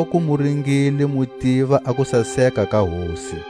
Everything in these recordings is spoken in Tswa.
loku mu ringile mu tiva a kusaseka ka Hosi.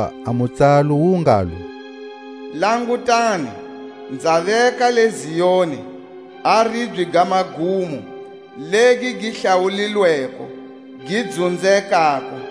Hakuva a mutsalo wu ngalo: Langutani, nza veka le Zioni a ribye ga magumo, legi gi hlawulilweko, gi dzunzekako;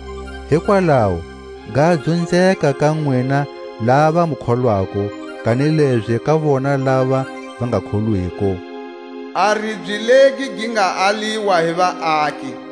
Hikwalaho ga dzunzeka ka nwina lava mu kholwako, kanilezi ka vona lava va nga kholwiko, A ribye legi gi nga aliwa hi vaaki,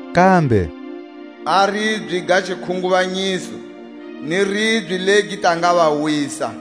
Kambe: A ribye ga xikhunguvanyiso, ni ribye legi gi ta nga va wisa.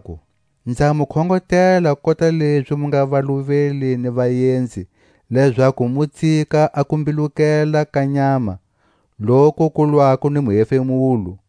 Varanzekako, nza mu khongotela kota lezi mu nga valuveli ni vaenzi, lezaku mu tsika a kumbilukela ka nyama, loku ku lwako ni muhefemulo;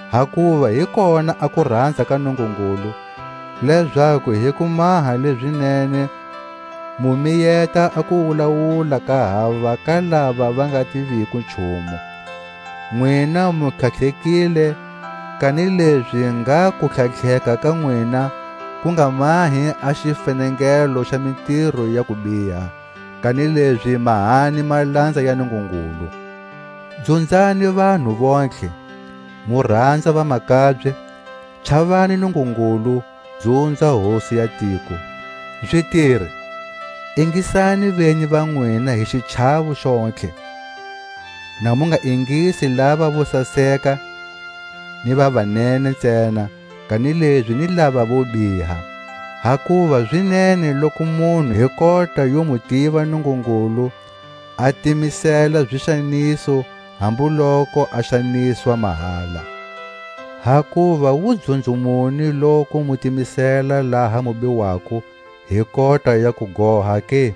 Hakuva hi kona a kuranza ka Nungungulu, lezaku hi ku maha leʼzi nene mu miyeta a kuwulawula ka hava ka lava va nga tiviko nchumu. Nwina mu tlhatlhekile, kanilezi ngha kutlhatlheka ka nwina ku nga mahi a xifenengelo xa mitiro ya kubiha, kanilezi mahani malanza ya Nungungulu. Dzunzani vanhu vontlhe, mu ranza vamakabye; chavani Nungungulu, mu dzunza hosi ya tiko. Zitiri, ingisani venyi va nwina hi xichawo xontlhe; na mu nga ingisi lava vo saseka ni va va nene ntsena, kanilezi ni lava vo biha. Hakuva zi nene loku munhu hi kota yo mu tiva Nungungulu a timisela zixaniso hambu loku a xaniswa mahala. Hakuva wudzunzo muni loku mu timisela laha mu biwako hi kota ya kugoha ke?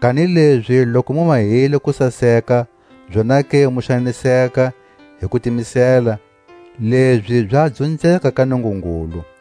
Kanilezi loku mu mahile kusaseka, zonake mu xaniseka hi kutimisela, lezi za dzunzeka ka Nungungulu.